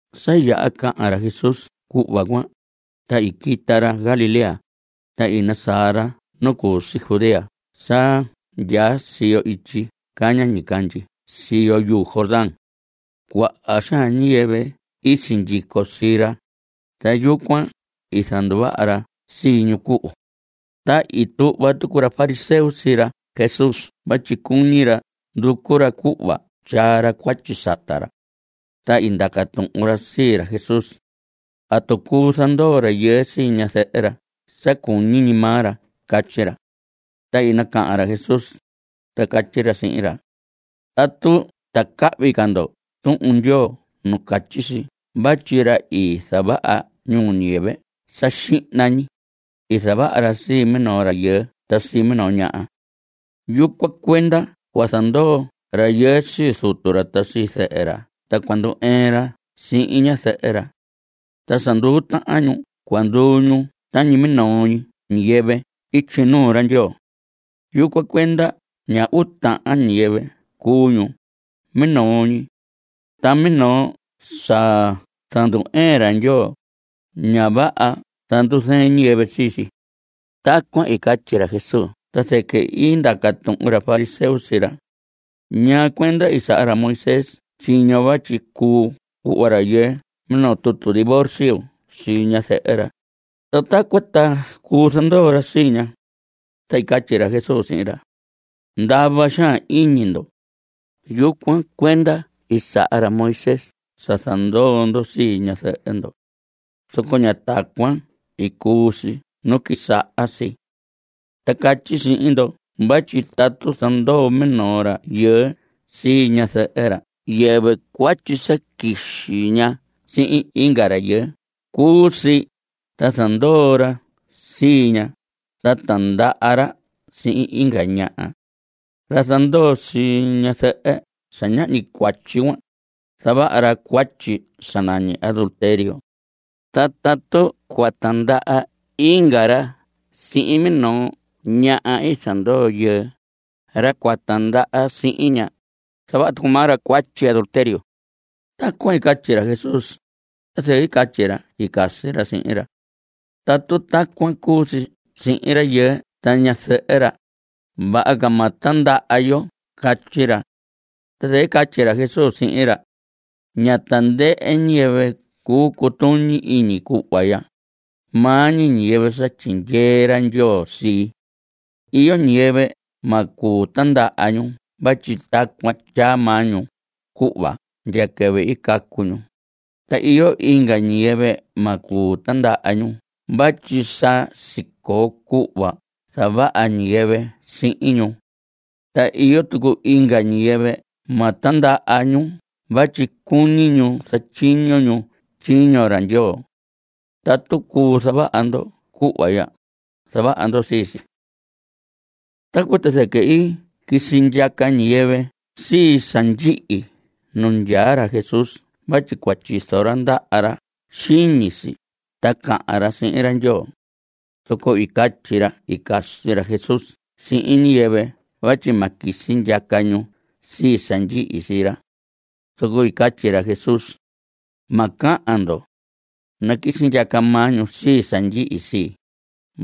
Sa yaha cahan ra Jesús cuhva cuan, ta i quita ra Galilea, ta i nasaa ra nu cu si Judea sa ndyaa siyo ityi caña ñicandyi siyo yuu Jordán. Cuaha xaan ñiyɨvɨ i sindyico sii ra, ta yucuan i zanduvaha ra sii ñu cuhu. Ta i tuhva tucu ra fariseo sii ra Jesús vatyi cuñi ra nducu ra cuhva tyaa ra cuatyi sata ra. Ta i ndaca tuhun ra sii ra Jesús: ¿Atu cuu zandoo rayɨɨ sii ñazɨhɨ ra sa cuñi ñi maa ra? Catyi ra. Ta i nacahan ra Jesús, ta catyi ra sihin ra: ¿Atu ta cahvi ca ndo Tuhun Ndyoo nu catyi si vatyi ra i zavaha ñiyɨvɨ sa xihna ñi, i zavaha ra sii minoo rayɨɨ ta sii minoo ñaha? Yucuan cuenda cua zandoo rayɨɨ sii zutu ra ta zɨhɨ ra, ta cua ndu‑ɨɨn ra sihin ñazɨhɨ ra. Ta sa nduu tahan ñu cua nduu ñu tañi minoo ñi ñiyɨvɨ ityi nuu ra Ndyoo. Yucuan cuenda ña uu tahan ñiyɨvɨ cuu ñu, minoo ñi. Ta minoo sa zandu‑ɨɨn ra Ndyoo, ña vaha zanduzɨɨn ñiyɨvɨ sii si. Tacuan i catyi ra Jesús ta zɨquɨ i ndaca tuhun ra fariseo sii ra: ¿Ñaa cuenda i saha ra Moisés tyiño vatyi cuu cuhva rayɨɨ minoo tutu divorcio sii ñazɨhɨ ra, ta tacuan ta cuu zandoo ra sii ña? Ta i catyi ra Jesús sihin ra: Ndava xaan iñi ndo. Yucuan cuenda i saha ra Moisés sa zandoo ndo sii ñazɨhɨ ndo. Zoco ña tacuan i cuu si nu quisaha si. Ta catyi sihin ndo vatyi tatu zandoo minoo rayɨɨ sii ñazɨhɨ ra ta yɨvɨ cuatyi sa quixi ña sihin inga rayɨɨ cu si ta zandoo ra sii ña ta tindaha ra sihin inga ñaha. Ra zandoo sii ñazɨhɨ sa ñahñi cuatyi cuan, zavaha ra cuatyi sa nañi adulterio. Ta tatu cua tindaha inga ra sihin minoo ñaha i zandoo yɨɨ, ra cua tindaha sihin ña, zavaha tucu maa ra cuatyi adulterio. Tacuan i catyi ra Jesús, ta zɨquɨ i catyi ra i casi ra sihin ra: Tatu tacuan cuu si sihin rayɨɨ ta ñazɨhɨ ra, vaha ca ma tindaha yo. Catyi ra. Ta zɨquɨ i catyi ra Jesús sihin ra: Ña tandɨhɨ ñiyɨvɨ cuu cutuñi iñi cuhva ya, maa ñi ñiyɨvɨ sa tyindyee ra Ndyoo sii. Iyo ñiyɨvɨ ma cuu tindaha ñu vatyi tacuan ndyaa maa ñu cuhva ndya quɨvɨ i cacu ñu. Ta iyo inga ñiyɨvɨ ma cuu tindaha ñu vatyi sa sicoo cuhva zavaha ñiyɨvɨ sihin ñu. Ta iyo tucu inga ñiyɨvɨ ma tindaha ñu vatyi cuñi ñu zatyiño ñu tyiño ra Ndyoo. Tatu cuu zavaha ndo cuhva ya, zavaha ndo sii si. Tacuan ta zɨquɨ i quisi ndyaca ñiyɨvɨ sii sa ndyihi nu ndyaa ra Jesús vatyi cua tyizo ra ndaha ra xiñi si ta cahan ra sihin ra Ndyoo. Zoco i catyi ra i casi ra Jesús sihin ñiyɨvɨ vatyi ma quisi ndyaca ñu sii sa ndyihi sii ra. Zoco i catyi ra Jesús: Ma cahan ndo. Naquisi ndyaca maa ñu sii sa ndyihi sii,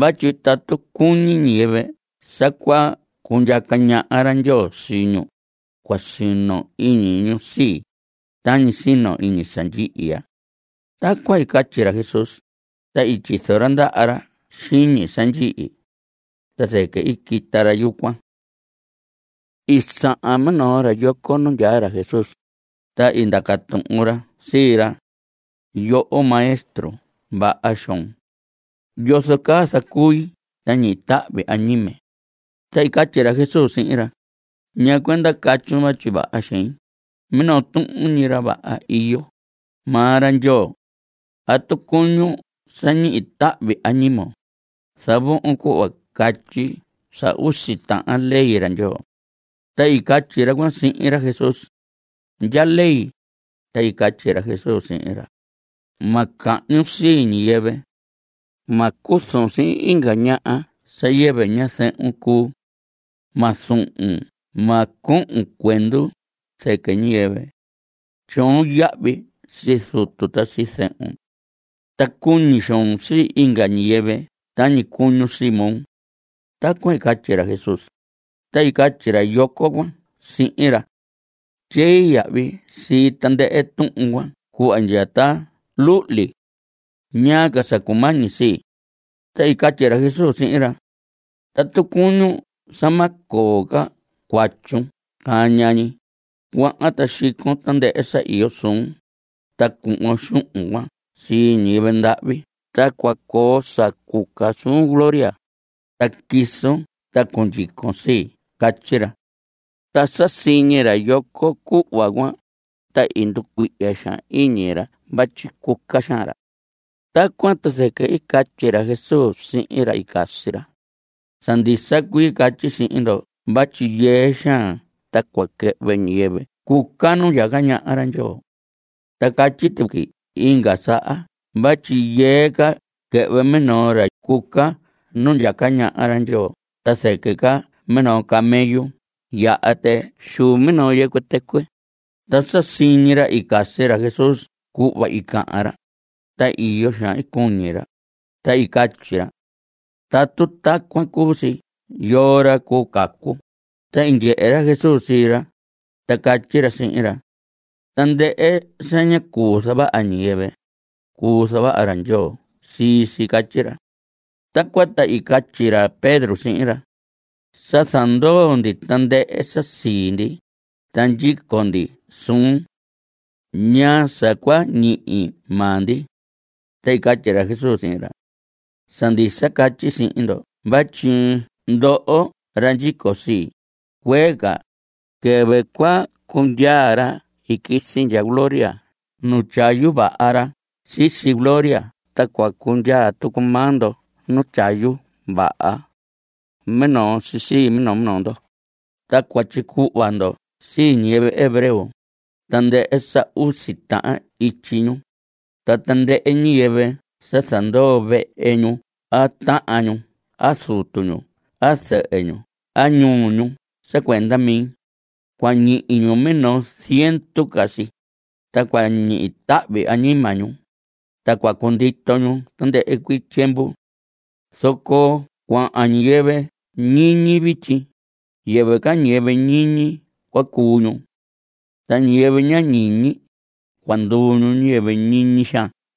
vatyi tatu cuñi ñiyɨvɨ sa cua cundyaca ñaha ra Ndyoo sii ñu, cua sino iñi ñu sii, tañi sino iñi sa ndyihi ya. Tacuan i catyi ra Jesús, ta i tyizo ra ndaha ra xiñi sa ndyihi. Ta zɨquɨ i quita ra yucuan. I sahan minoo ra yoco nu ndyaa ra Jesús, ta i ndaca tuhun ra sii ra: Yoho maestro vaha xoon. ¿Yozo caa zacui ta ñihi tahvi añime? Ta i catyi ra Jesús sihin ra: ¿Ñaa cuenda catyun vatyi vaha xein? Minoo tuhun ñi ra vaha iyo, maa ra Ndyoo. Tatu cuñun sa ñihi tahvi añimon, zavohon cuhva catyi sa usi tahan ley ra Ndyoo. Ta i catyi ra cuan sihin ra Jesús: ¿Ndya ley? Ta i catyi ra Jesús sihin ra: Ma cahñun sii ñiyɨvɨ. Ma cuzun sihin inga ñaha sa yɨvi ñazɨhun cuu. Ma zuhun. Ma cohon cuendu zɨquɨ ñiyɨvɨ. Tyoon yahvi sii zutun ta sii zɨhun. Ta cuñi xoon sii inga ñiyɨvɨ tañi cuñun sii moo. Tacuan i catyi ra Jesús, ta i catyi ra yoco cuan sihin ra: Tyei yahvi sii tandɨhɨ tuhun cuan cuhva ndya ta luhli. ¿Ñaa ca sa cumañi sii? Ta i catyi ra Jesús sihin ra: Tatu cuñun sa ma coo ca cuatyun caña ñi, cuahan, ta xicon tandɨhɨ sa iyo suun, ta cuhvon xuhun cuan sii ñiyɨvɨ ndahvi ta cua coo sa cuca suun gloria, ta quisun ta cundyicon sii. Catyi ra. Ta sa siñi ra yoco cuhva cuan, ta i nducuihya xaan iñi ra vatyi cuca xaan ra. Tacuan ta zɨquɨ i catyi ra Jesús sihin ra i casi ra: Sa ndisa cuii catyi sihin ndo vatyi yɨɨ xaan ta cua quɨhvɨ ñiyɨvɨ cuca nu ndyaca ñaha ra Ndyoo. Ta catyi tuqui inga saha vatyi yɨɨ ca quɨhvɨ minoo ra cuca nu ndyaca ñaha ra Ndyoo ta zɨquɨ ca minoo camello yaha tɨ xuu minoo yɨcuɨ tɨcuɨ. Ta sa siñi ra i casi ra Jesús cuhva i cahan ra, ta iyo xaan i cuñi ra, ta i catyi ra: Tatu tacuan cuu si ¿yoo ra cuu cacu? Ta i ndyehe ra Jesús sii ra, ta catyi ra sihin ra: Tandɨhɨ sa ña cuu zavaha ñiyɨvɨ, cuu zavaha ra Ndyoo sii si. Catyi ra. Tacuan ta i catyi ra Pedro sihin ra: Sa zandoo ndi tandɨhɨ sa sii ndi, ta ndyico ndi suun. ¿Ñaa sa cua ñihi maa ndi? Ta i catyi ra Jesús sihin ra: Sa ndisa catyi sihin ndo vatyi ndoho ra ndyico sii, cuee ca, quɨvɨ cua cundyaa ra i quisi ndya gloria nu tyayu vaha ra sisi gloria ta cua cundyaa tucu maa ndo nu tyayu vaha. Minoo si sii minoo minoo ndo, ta cua tyicuhva ndo sii ñiyɨvɨ hebreo, tandɨhɨ sa usi uu tahan ityi ñu. Ta tandɨhɨ ñiyɨvɨ sa zandoo vehe ñu a tahan ñu a zutu ñu a zɨhɨ ñu a ñuhu ñu sa cuenda mi, cua ñihi ñu minoo ziendu ca si, ta cua ñihi tahvi añima ñu, ta cua cundito ñu tandɨhɨ cuii tyiemvu. Zoco cuaha ñiyɨvɨ ñiñi vityi, yɨvɨ ca ñiyɨvɨ ñiñi cua cuu ñu. Ta ñiyɨvɨ ña ñiñi, cua nduu ñu ñiyɨvɨ ñiñi xaan.